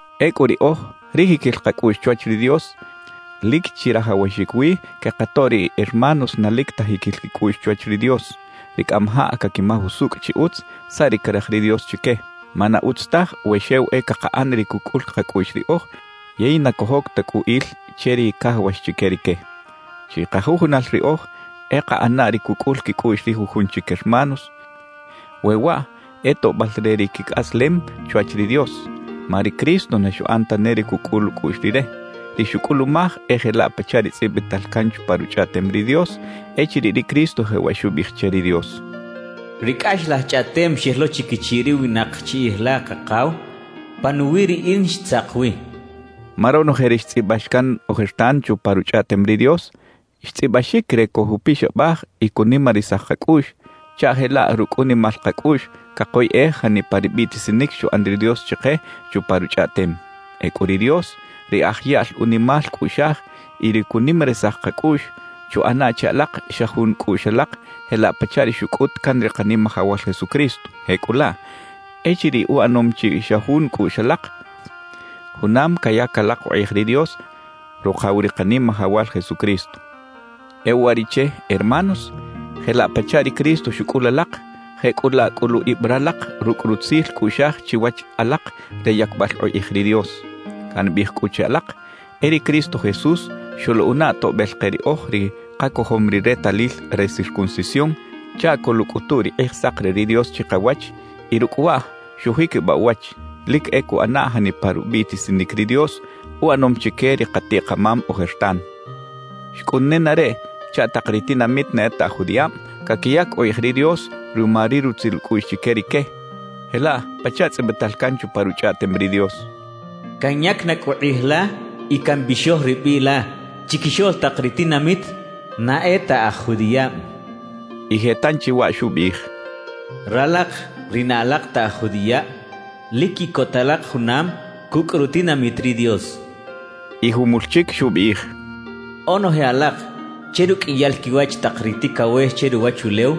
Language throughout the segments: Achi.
Ecꞌu riꞌoj ri jiquil kacꞌuꞌx chwach ri Dios, lic chirajawaxic wi quekatoꞌ ri hermanos na lic ta jiquil quicꞌuꞌx chwach ri Dios, ri cꞌamajaꞌ caquimaj usucꞌ chi utz saꞌ ri caraj ri Dios chique. Ma na utz taj we xew e cakaꞌan ri cucꞌul kacꞌuꞌx riꞌoj yey na cojoc ta cꞌu il che ri cajawax chique rique. Chikajujunal riꞌoj e kaꞌana ri cucꞌul quicꞌuꞌx ri jujun chic hermanos we waꞌ e toꞌbal re ri quicꞌaslem chwach ri Dios. Ma ri Cristo na xuꞌan tane ri cucꞌul ucꞌuꞌx Rire. Ri xucꞌulumaj e jelaꞌ pachaꞌ ri tzꞌibital can chupa Ruchꞌaꞌtem ri Dios echiriꞌ ri Cristo jewaꞌ xubiꞌij che ri Dios: Ri cꞌaxlaj chꞌaꞌtem xel lo chiquichiꞌ ri winak chiꞌij la, Kakaw, panuwiꞌ riꞌin xtzak wi xchaꞌ. Ma ronoje ri xtzꞌibax can ojertan chupa Ruchꞌaꞌtem ri Dios, xtzꞌibaxic re cojupixabaj y cunimarisaj kacꞌuꞌx, chaꞌ jelaꞌ rucꞌ unimal kacꞌuꞌx cakoyꞌej janipa ri biꞌtisinic xuꞌan ri Dios chike chupa Ruchꞌaꞌtem. Ecꞌu ri Dios, ri aj yaꞌl unimal cꞌuꞌxaj y ri cunimarisaj kacꞌuꞌx, chuꞌana che alak xa jun cꞌuꞌx alak jelaꞌ pachaꞌ ri xucꞌut can ri Kanimajawal Jesucristo. Jecꞌulaꞌ, echiriꞌ uꞌanom chi xa jun cꞌuꞌx alak, junam cayac alak ukꞌij ri Dios, Rukaw ri Kanimajawal Jesucristo. E uwariꞌche, hermanos, jelaꞌ pachaꞌ ri Cristo xucꞌul alak, jecꞌulaꞌ cꞌulu ib ralak rucꞌ rutzil cꞌuꞌxaj chiwach alak re yacbal ukꞌij ri Dios. Cambiꞌij cꞌu che alak, e ri Cristo Jesús xoluꞌana toꞌbel ke riꞌoj ri kacojom ri retalil re circuncisión chaꞌ coluꞌcꞌutu ri Kꞌijsak re ri Dios chikawach y rucꞌ waꞌ xujiquibaꞌ uwach, lic e cuꞌana janipa rubiꞌtisinic ri Dios uꞌanom chique ri katiꞌ-kamam ojertan. Xcꞌun nenareꞌ chaꞌ tak ri tinamit na e ta aj judiꞌab caquiyac ukꞌij ri Dios ruma ri rutzil ucꞌuꞌx chique rique, jelaꞌ pachaꞌ tzꞌibital can chupa Ruchꞌaꞌtem ri Dios: Canyac na cꞌu kꞌij la y cambixoj ri biꞌ la chiquixoꞌl tak ri tinamit na e ta aj judiꞌab. Y je tanchi waꞌ xubiꞌij: Ralak ri na alak ta aj judiꞌab, lic quiꞌcota alak junam cucꞌ rutinamit ri Dios. Y jumul chic xubiꞌij: Onoje alak che ruqꞌuiyal quiwach tak ri ticawex che ruwachulew,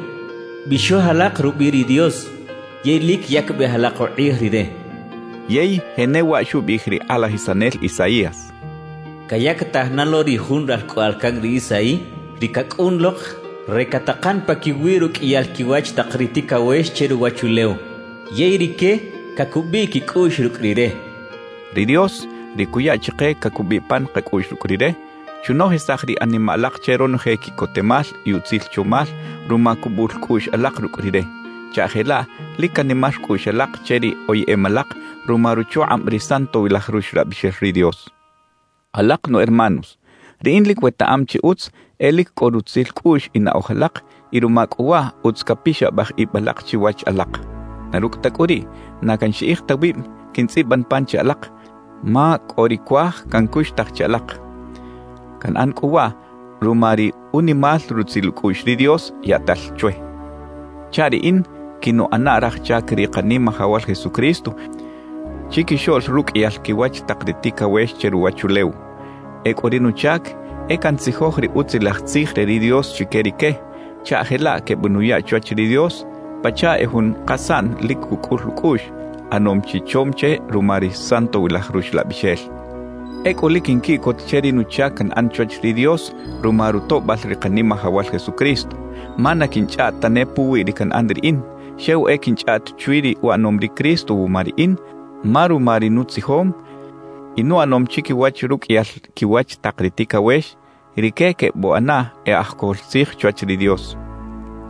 bixoj alak rubiꞌ ri Dios, yey lic yacbej alak ukꞌij Rire. Yey jenewaꞌ xubiꞌij ri kꞌalajisanel Isaías: Cayactaj na lo ri Jun ralcꞌoꞌal can ri Isaí, ri cacꞌun lok re catakan paquiwi ruqꞌuiyal quiwach tak ri ticawex che ruwachulew. Yey rique cacubiꞌ quicꞌuꞌx rucꞌ Rire xchaꞌ. Ri Dios, ri cuya chike cacubiꞌ pan kacꞌuꞌx rucꞌ Rire, chunojisaj ri animaꞌ alak che ronoje quiꞌcotemal y utzil chomal ruma cubul cꞌuꞌx alak rucꞌ Rire, chaꞌ jelaꞌ lic canimar cꞌuꞌx alak che ri oyeꞌem alak ruma ruchukꞌab ri Santowilaj Ruxlabixel ri Dios. Alak nu hermanos, riꞌin lic wetaꞌam chi utz e lic cꞌo rutzil cꞌuꞌx y naꞌoj alak y ruma cꞌu waꞌ utz capixabaj ib alak chiwach alak. Na rucꞌ ta cꞌu riꞌ, na canxiꞌij ta wib quintzꞌiban pan che alak, ma cꞌo ri cuaj cancuxtaj che alak. Canꞌan cꞌu waꞌ ruma ri unimal rutzil ucꞌuꞌx ri Dios yaꞌtal chwe chaꞌ riꞌin quinuꞌana raj chac ri Kanimajawal Jesucristo chiquixoꞌl ruqꞌuiyal quiwach tak ri ticawex che ruwachulew. Ecꞌu ri nuchac e cantzijoj ri Utzilaj Tzij re ri Dios chique rique, chaꞌ jelaꞌ quebenuya chwach ri Dios pachaꞌ e jun kasaꞌn lic cucꞌul ucꞌuꞌx, ꞌanom chi chom che ruma ri Santowilaj Ruxlabixel. Ecꞌu lic quinquiꞌcot che ri nuchac canꞌan chwach ri Dios ruma rutoꞌbal ri Kanimajawal Jesucristo. Ma na quinchꞌaꞌt tane puwi ri canꞌan riꞌin, xew e quinchꞌaꞌt chwi ri uꞌanom ri Cristo wuma riꞌin; ma ruma ri nutzijom y nuꞌanom chiquiwach ruqꞌuiyal quiwach tak ri ticawex, rique quebuꞌana e aj cojol tzij chwach ri Dios.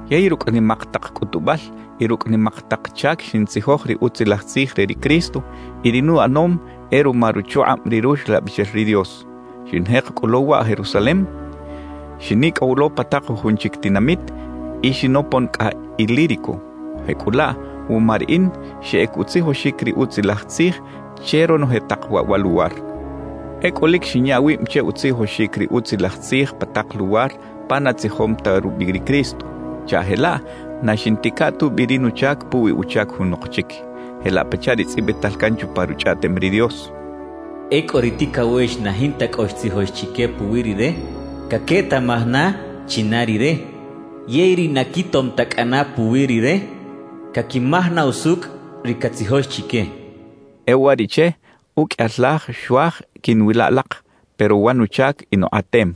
Yey rucꞌ nimak tak cꞌutubal y rucꞌ nimak tak chac xintzijoj ri Utzilaj Tzij re ri Cristo; y ri nuꞌanom e ruma ruchukꞌab ri Ruxlabixel ri Dios. Xinjek cꞌu lo waꞌ Jerusalem, xinicꞌow lo pa tak jujun chic tinamit y xinopon cꞌa Ilírico. Jecꞌulaꞌ wuma riꞌin xeꞌec utzijoxic ri Utzilaj Tzij che ronoje tak waꞌ wa luwar. Ecꞌu lic xinya wib che utzijoxic ri Utzilaj Tzij pa tak luwar pa na tzijom ta rubiꞌ ri Cristo, chaꞌ jelaꞌ na xiꞌntica tubi ri nuchac puwi uchac junok chic, jelaꞌ pachaꞌ ri tzꞌibital can chupa Ruchꞌaꞌtem ri Dios: Ecꞌu ri ticawex na jinta cꞌo xtzijox chique puwi Rire, caquetaꞌmaj na china Rire; yey ri na quitom ta cꞌana puwi Rire, caquimaj na usucꞌ ri catzijox chique cachaꞌ. E uwariꞌche, uqꞌuiyal laj xuaj quiꞌnwila alak, pero wa nuchac inukꞌatem;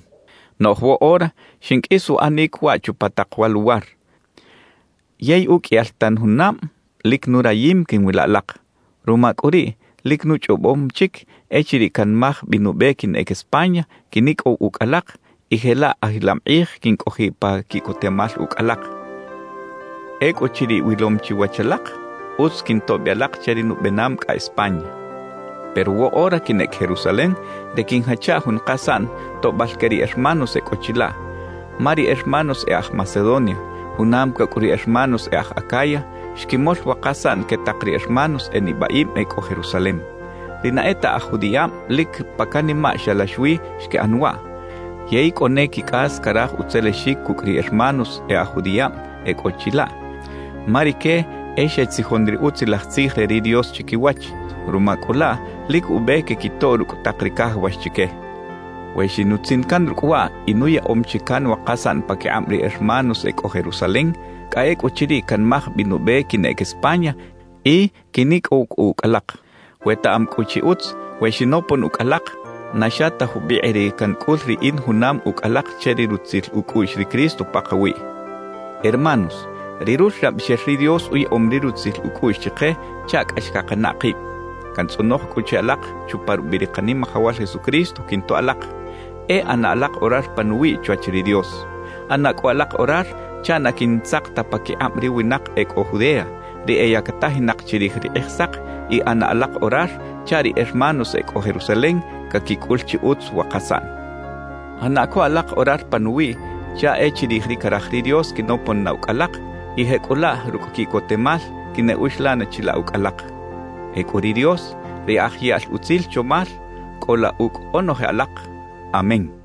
noꞌj woꞌora xinqꞌuis uꞌanic waꞌ chupa tak wa luwar. Yey uqꞌuiyal tan junab lic nurayim quiꞌnwila alak; ruma cꞌu riꞌ, lic nuchꞌobom chic, echiriꞌ canmaj bi nube quinꞌec España, quinicꞌow ucꞌ alak y jelaꞌ ajilam kꞌij quincꞌojiꞌ pa quiꞌcotemal ucꞌ alak. Ecꞌuchiriꞌ wilom chi wach alak, utz quintoꞌ bi alak che ri nubenam cꞌa España. Pero woꞌora quinꞌec Jerusalem re quiꞌnjacha jun kasaꞌn toꞌbal que ri hermanos e cꞌo chilaꞌ; ma ri hermanos e aj Macedonia, junam cucꞌ ri hermanos e aj Acaya, xquimol wa kasaꞌn que tak ri hermanos e nibaꞌib e cꞌo Jerusalem. Ri na e ta aj judiꞌab lic pa canimaꞌ xalax wi xquiꞌan waꞌ. Yey cꞌo ne quicꞌas caraj utzelexic cucꞌ ri hermanos e aj judiꞌab e cꞌo chilaꞌ, ma rique e xetzijon ri Utzilaj Tzij re ri Dios chiquiwach. Ruma cꞌu laꞌ lic ube quequitoꞌ rucꞌ tak ri cajawax chique. We xinutzin can rucꞌ waꞌ y nuyaꞌom chi can wa kasaꞌn paquikꞌab ri hermanos e cꞌo Jerusalem, cꞌa ecꞌuchiriꞌ canmaj bi nube quinꞌec España y quinicꞌow cꞌu ucꞌ alak. Wetaꞌam cꞌu chi utz, we xinopon ucꞌ alak, na xa ta jubikꞌ ri cancꞌul riꞌin junam ucꞌ alak che ri rutzil ucꞌuꞌx ri Cristo pakawiꞌ. Hermanos, ri Ruxlabixel ri Dios uyaꞌom ri rutzil ucꞌuꞌx chike chaꞌ cꞌax cakanaꞌ kib. Cantzꞌonoj cꞌu che alak chupa rubiꞌ ri Kanimajawal Jesucristo quintoꞌ alak, e ꞌana alak orar panuwiꞌ chwach ri Dios. ꞌAna cꞌu alak orar chaꞌ na quintzak ta paquikꞌab ri winak e cꞌo Judea, ri eyacatajinak chirij ri Kꞌijsak; y ꞌana alak orar chaꞌ ri hermanos e cꞌo Jerusalem caquicꞌul chi utz wa kasaꞌn. ꞌAna co alak orar panuwiꞌ chaꞌ e chirij ri caraj ri Dios quinopon na ucꞌ alak, y jecꞌulaꞌ rucꞌ quiꞌcotemal quineꞌuxlan chilaꞌ ucꞌ alak. Ecꞌu ri Dios, ri aj yaꞌl utzil chomal, cꞌola ucꞌ onoje alak. Amén.